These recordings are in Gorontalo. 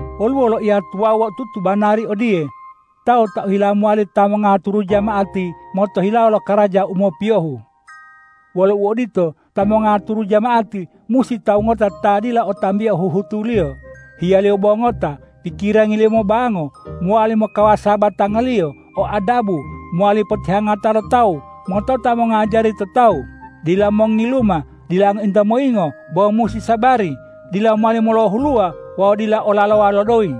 Woluwo loiya tuwawu otutu banari odiye,”Tawu ta ohila mowali ta mongaturu jama'ati motohilawo lo karaja u mopiyohu.” Wolo uodito, ta mongaturu jama'ati musi tawu ngota ta dila o tambio huhutuliyo, hiyaliyo bo ngota, pikirangiliyo mobango, mowali mokawasa batangaliyo, o adabu, mowali potihangata lo tawu, motota mongajari to tawu, dila mongiluma, dila ngointa moyingo bo musi sabari, dila mowali molohuluwa wawu dila olalowa lo doyi.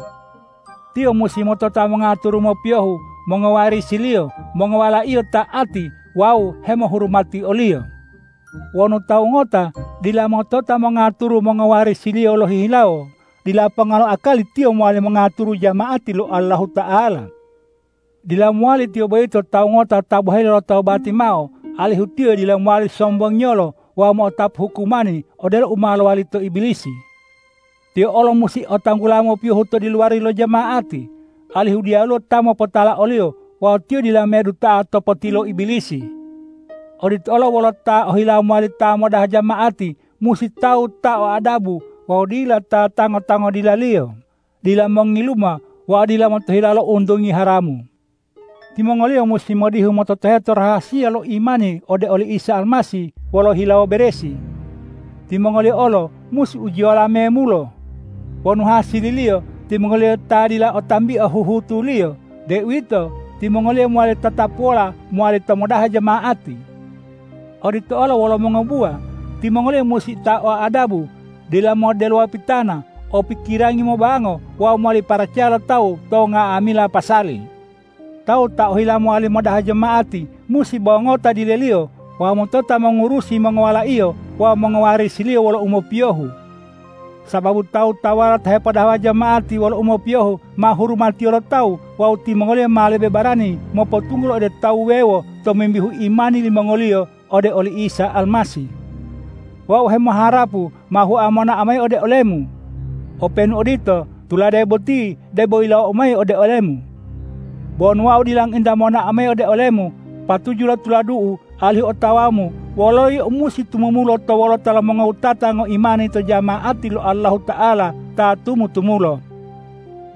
Tiyo musi motota mongaturu mopiyohu mongowarisiliyo, mongowalaiyo ta'ati wawu hemohurumati oliyo. Wonu tawu ngota dila motota mongaturu mongowarisiliyo lohihilawo, dila ponga lo akali tiyo mowali mongaturu jama'ati lo Allahuta'ala. Dila mowali tiyo boyito tawu ngota ta boheli lotobati, mao alihu tiyo dila mowali sombongiyolo wawu mo'otapu hukumani odelo u ma lowali to Ibilisi. Tiyo olo musi o tilanggula mopiyohu to diluwari lo jama'ati, alihu diyaluwo ta mopotala oliyo wawu tiyo dila meduta'a to potilo Ibilisi. Odito olo wolo ta ohilawo mowali ta modaha jama'ati musi tawu ta o adabu wawu dila ta tango-tango dilaliyo, dila mongiluma wawu dila motohilawo lo untungi haramu. Timongoliyo musi modihu mototoheto rahasiya lo imani ode oli Isa Almasih wolo hilawo beresi. Timongoliyo olo musi ujiyola memulo. Wonu hasililiyo timongoliyo ta dila o tambio huhutuliyo, deuwito timongoliyo mowali tatapuwola mowali ta modaha jama'ati. Odito olo wolo mongobuwa, timongoliyo musi ta o adabu, dila moddelowa pitana, o pikirangi mobango wawu mowali paracaya lo tawu to nga'amila pasali. Tawu ta ohila mowali modaha jama'ati musi bo ngota dileliyo wawu motota mongurusi mongowalaiyo wawu mongowarisiliyo wolo umopiyohu. Sababu tawu-tawuwala ta hepodahawa jama'ati wolo umopiyohu ma hurumatiyo lo tawu wawu timongoliyo ma lebe barani mopotunggula ode tawu wuwewo tomimbihu imani limongoliyo ode oli Isa Almasih. Wau hemoharapu ma hua monao mayi ode olemu. Openu odito, tulade boti debo yilawou mayi ode olemu. Bo wonu wau dila ngointa mo'onao mayi ode olemu, patuju lo tuladu'u alihu otawamu wololo yio musi tumumulo to wolota lo mongowutata ngoimani jama'ati lo Allahuta'ala ta tumu-tumulo.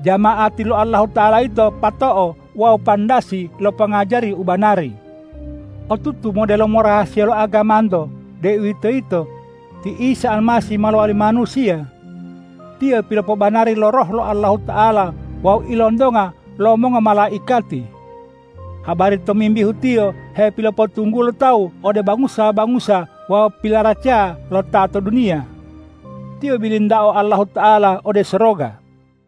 Jama'ati lo Allahuta'ala yito pato'o wawu pandasi lo pongajari u banari. Otutu modelomo rahasiya lo agamanto deuwitoyito: Ti Isa Almasih ma lowali manusiya. Tiyo pilopobanari lo Roh lo Allahuta'ala wawu ilontonga lo mongomalaikati. Habari tomimbihu Tiyo hepilopotunggulo tawu ode bangusa-bangusa wawu pilaracaya lo ta to duniya. Tiyo bilintao Allahuta'ala ode soroga.